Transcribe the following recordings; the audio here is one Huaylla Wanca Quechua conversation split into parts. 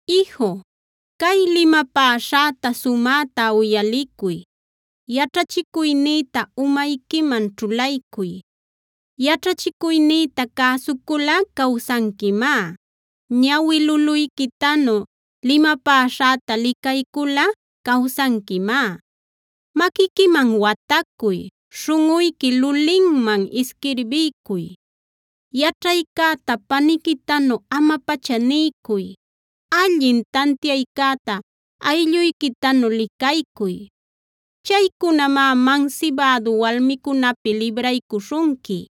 Iju, cay limapäśhäta sumäta uyalicuy; yaćhachicuynïta umayquiman ćhulaycuy. Yaćhachicuynïta cäsuculꞌa cawsanquimá; ñawi luluyquitanu limapäśhäta licayculꞌa cawsanquimá. Maquiquiman watacuy, śhunꞌuyqui lulinman isquirbiycuy. Yaćhaycäta paniquitanu ama-pacha niycuy; allin tantiaycäta aylluyquitanu licaycuy. Chaycunamá mansibädu walmicunäpi libraycuśhunqui;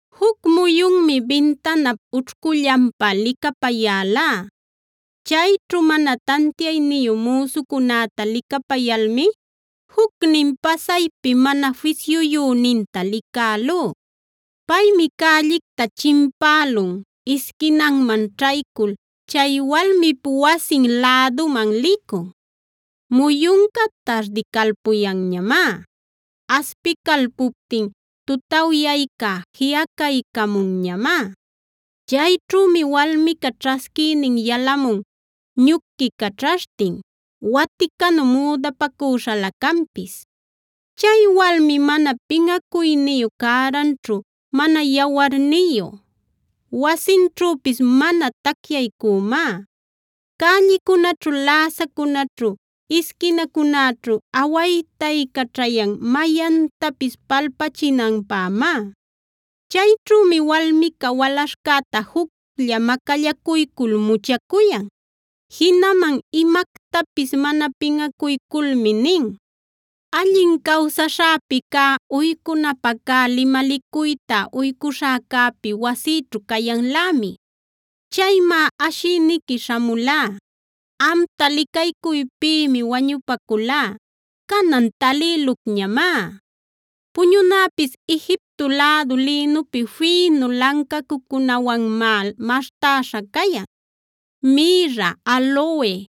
Juc muyunmi bintanap ućhcullanpa licapayälá. Chayćhu mana tantiayniyu müsucunäta licapayalmi jucnin pasaypi mana fisyuyüninta licälú. Paymi cällicta chimpälun, isquinanman ćhaycul chay walmip wasin läduman licun. Muyunca tardicalpunñamá; aspicalpuptin tutawyayca jiꞌacaycamunñamá. Chayćhümi walmica ćhasquïnin yalämun ñuquicaćhashtin, waticanu müdapacüśhalä canpis. Chay walmi mana pinꞌacuyniyu, cäranćhu mana yawarniyu; wasinćhüpis mana tacyaycümá. Cällicunäćhu, läsacunäćhu, isquinacunäćhu awaytaycaćhayan mayantapis palpachinanpämá. Chayćhümi walmica walaśhcäta juclla macallacuycul muchacuyan. Jinaman imactapis mana pinꞌacuyculmi nin: “Allin cawsaśhäpi cä uycunapä cä limalicuytab uycuśhäcäpi wasïćhu cayanlämi. Chaymá ashïniqui śhamulá; amta licaycuypïmi wañupaculá, canan talïlucñamá. Puñunäpis Egipto lädu lïnupi fïnu lancacucunawanmá maśhtäśha cayan. Mïrra, aloe,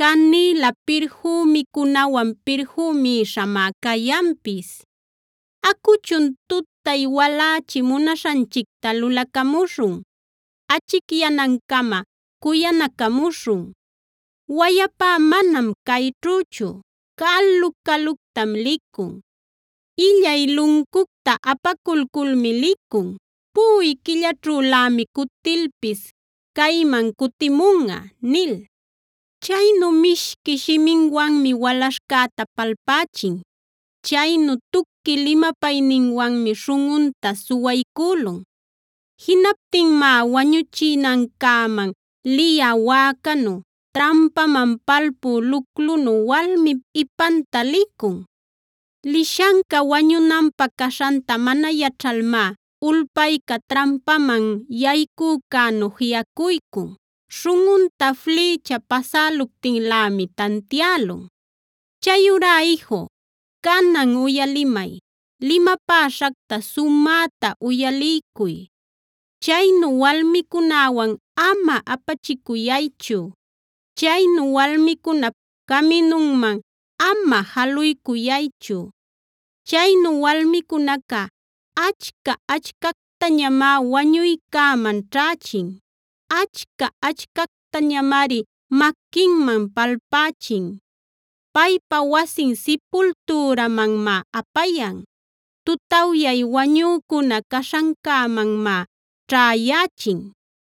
canïla pirfümicunawan pirfümïshamá cayanpis. Acuchun tutay walächi munaśhanchicta lulacamuśhun; achicyanancama cuyanacamuśhun. Wayapá manam cayćhüchu; calu-caluctam licun. Illay luncucta apaculculmi licun; puꞌuy quillaćhülämi cutilpis cayman cutimunꞌa” nil. Chaynu mishqui shiminwanmi walaśhcäta palpächin; chaynu tuqui limapayninwanmi śhunꞌunta suwaycülun. Jinaptinmá wañuchinancäman liyä wäcanu, trampaman palpü luclunu walmip ipanta licun. Lishanca wañunanpä caśhanta mana yaćhalmá ulpayca trampaman yaycücänu jiꞌacuycun; śhunꞌunta flïcha pasäluptinlämi tantiälun. Chayurá iju, canan uyalimay; limapäśhacta sumäta uyaliycuy. Chaynu walmicunäwan ama apachicuyaychu; chaynu walmicunap caminunman ama jaluycuyaychu. Chaynu walmicunaca achca-achcactañamá wañuycäman ćhächin; achca-achcactañamari maquinman palpächin. Paypa wasin sipultürämanmá apayan; tutawyay wañücuna caśhancämanmá ćhäyächin.